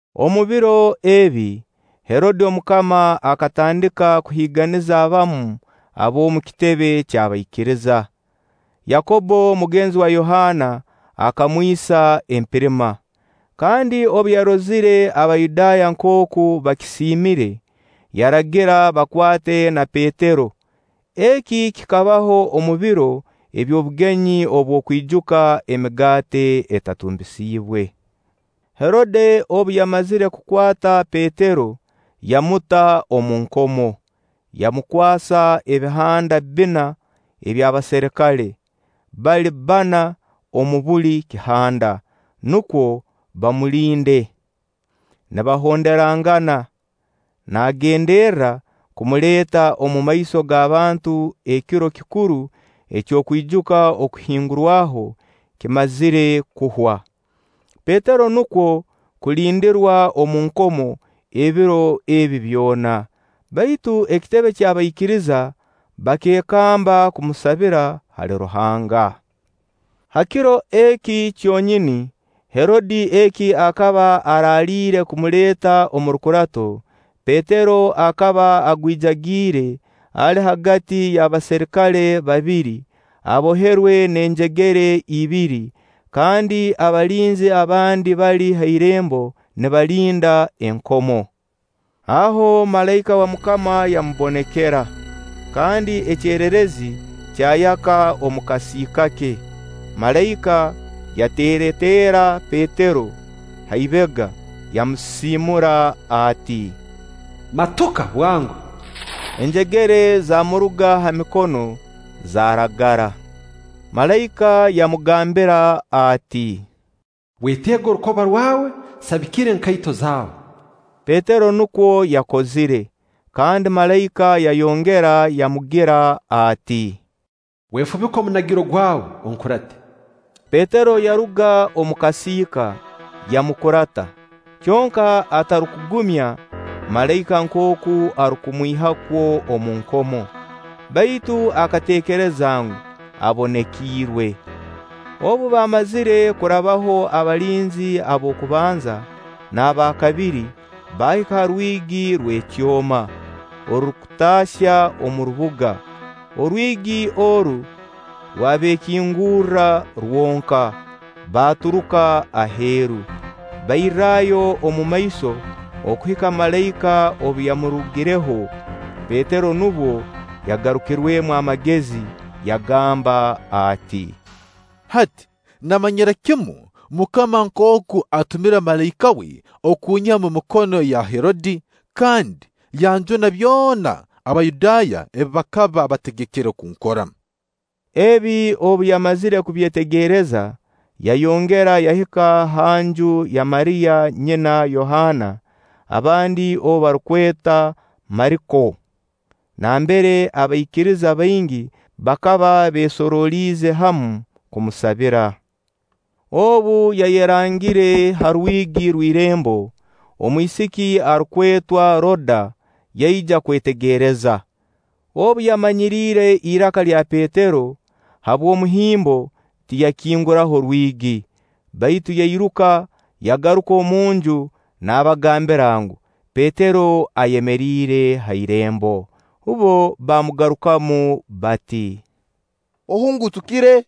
Omu biro ebi, Herode omukama akatandika kuhiiganiza abamu ab'omu kitebe ky'abaikiriza. Yakobbo, mugenzi wa Yohaana, akamwisa empirima. Kandi obu yarozire Abayudaaya nkooku bakisiimire, yaragira bakwate na Petero. Eki kikabaho omu biro eby'obugenyi obw'okwijuka Emigaati Etatumbisiibwe. Herode obu yamazire kukwata Petero, yamuta omu nkomo, yamukwasa ebihanda bbina eby'abaserikale, bali bbana mu buli kihanda, nukwo bamulinde nibahonderangana, naagenderra kumuleeta omu maiso g'abantu ekiro kikuru eky'okwijuka Okuhingurwaho kimazire kuhwa. Petero nukwo kulindirwa omu nkomo ebiro ebi byona; baitu ekitebe ky'abaikiriza bakeekamba kumusabira hali Ruhanga. Ha kiro eki kyonyini Herode eki akaba araaliire kumuleeta omu rukurato, Petero akaba agwijagiire, ali hagati y'abaserikale babiri, aboherwe n'enjegere ibiri, kandi abalinzi abandi bali ha irembo nibalinda enkomo. Aho malaika wa MUKAMA yamubonekera, kandi ekyererezi kyayaka omu kasiika ke. Malaika yateerateera Petero ha ibega, yamusisiimura ati: “Matuka bwango!” Enjegere zaamuruga ha mikono, zaaragara. Malaika yamugambira ati: “Weteege orukoba rwawe, sabikira enkaito zaawe.” Petero nukwo yakozire, kandi malaika yayongera yamugira ati: “Wefubike omunagiro gwawe, onkurate.” Petero yaruga mu kasiika, yamukurata; kyonka atarukugumya malaika nkooku arukumwiha kwo omu nkomo, baitu akateekereza ngu, abonekiirwe. Obu baamazire kurabaho abalinzi ab'okubanza n'aba kabiri, baahika ha rwigi rw'ekyoma, orurukutaahya omu rubuga. Orwigi oru rwabeekingurra rwonka; baaturuka aheeru. Bairrayo omumaiso okuhika malaika obu yamurugireho. Petero nubwo yagarukirwemu amagezi, yagamba ati: “Hati namanyira kimu MUKAMA nkooku atumire malaika we kunyiha omu mikono ya Herode, kandi yanjuna byona Abayudaaya ebi bakaba bategekere kunkora.” Ebi obu yamazire kubyetegereza, yayongera yahika ha nju ya Mariya nyina Yohaana, abandi ou barukweta Mariko, nambere abaikiriza baingi bakaba beesoroliize hamu kumusabira. Obu yayerangire ha rwigi rw'irembo, omwisiki arukwetwa Roda yaija kwetegereza. Obu yamanyiriire iraka lya Petero, habw'omuhimbo, tiyakinguraho rwigi, baitu yairuka yagaruka omunju naabagambira ngu, Petero ayemeriire ha irembo. Bbo baamugarukamu bati: “Ohungutukire.”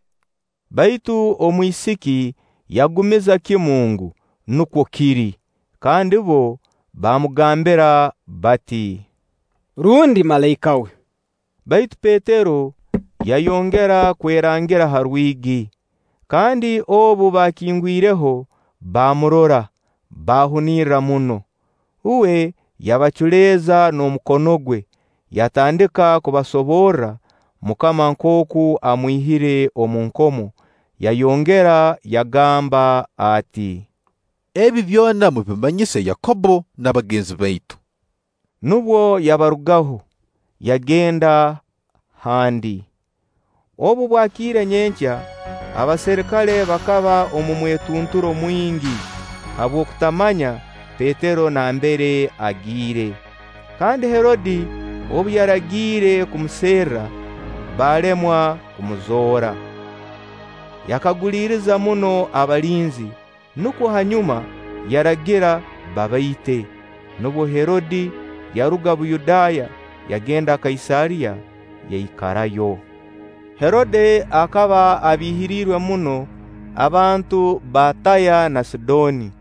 Baitu omwisiki yagumiza kimu ngu, nukwo kiri. Kandi bbo bamugambira bati: “Rundi malaika we!” Baitu Petero yayongera kwerangira ha rwigi, kandi obu bakingwireho baamurora, baahunirra muno. Uwe yabaculeeza n'omukono gwe, yatandika kubasoborra MUKAMA nkooku amwihire omu nkomo. Yayongera yagamba ati: “Ebi byona mubimanyise Yakobbo n'abagenzi baitu.” Nubwo yabarugaho, yagenda handi. Obu bwakiire nyenkya, abaserikale bakaba omu mwetunturo mwingi habw'okutamanya Petero nambere agiire. Kandi Herode obu yaragiire kumuserra, baalemwa kumuzoora. Yakaguliriza muno abalinzi, nukwo hanyuma yaragira babaite. Nubwo Herode yaruga Buyudaaya, yagenda Kaisaariya, yaikarayo. Herode akaba abiihirirwe muno abantu ba Tiiro na Sidooni;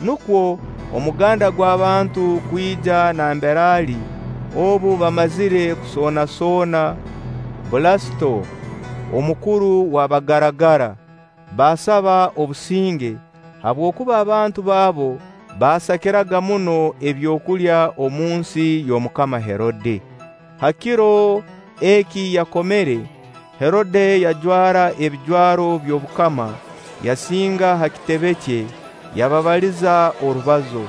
nukwo omuganda gw'abantu kwija nambere ali obu baamazire kusoonasoona Bulasito, omukuru wa bagaragara, baasaba obusinge, habwokuba abantu baabo baasakiraga muno ebyokulya omu nsi y'Omukama Herode. Ha kiro eki yakomere, Herode yajwara ebijwaro by'obukama, yasinga ha kitebe kye, yababaliza orubazo.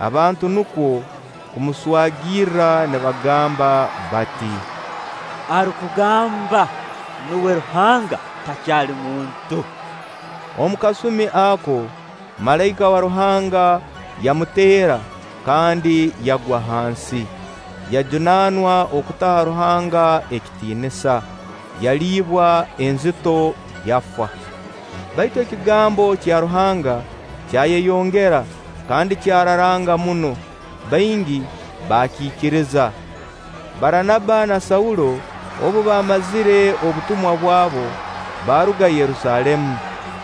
Abantu nukwo kumuswagira nibagamba bati: “Arukugamba nuwe ruhanga, takyali muntu!” Omu kasumi ako malaika wa Ruhanga yamuteera kandi yagwa hansi. Yajunaanwa okutaha Ruhanga ekitiinisa; yaliibwa enzito, yafa. Baitu ekigambo kya Ruhanga kyayeyongera kandi kyararanga muno, baingi baakiikiriza. Baranaba na Saulo obu baamazire obutumwa bwabo, baaruga Yerusaalemu,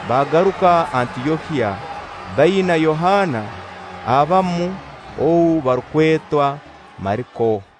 baagaruka Antyokiya baina Yohaana, abamu ou barukweta Mariko.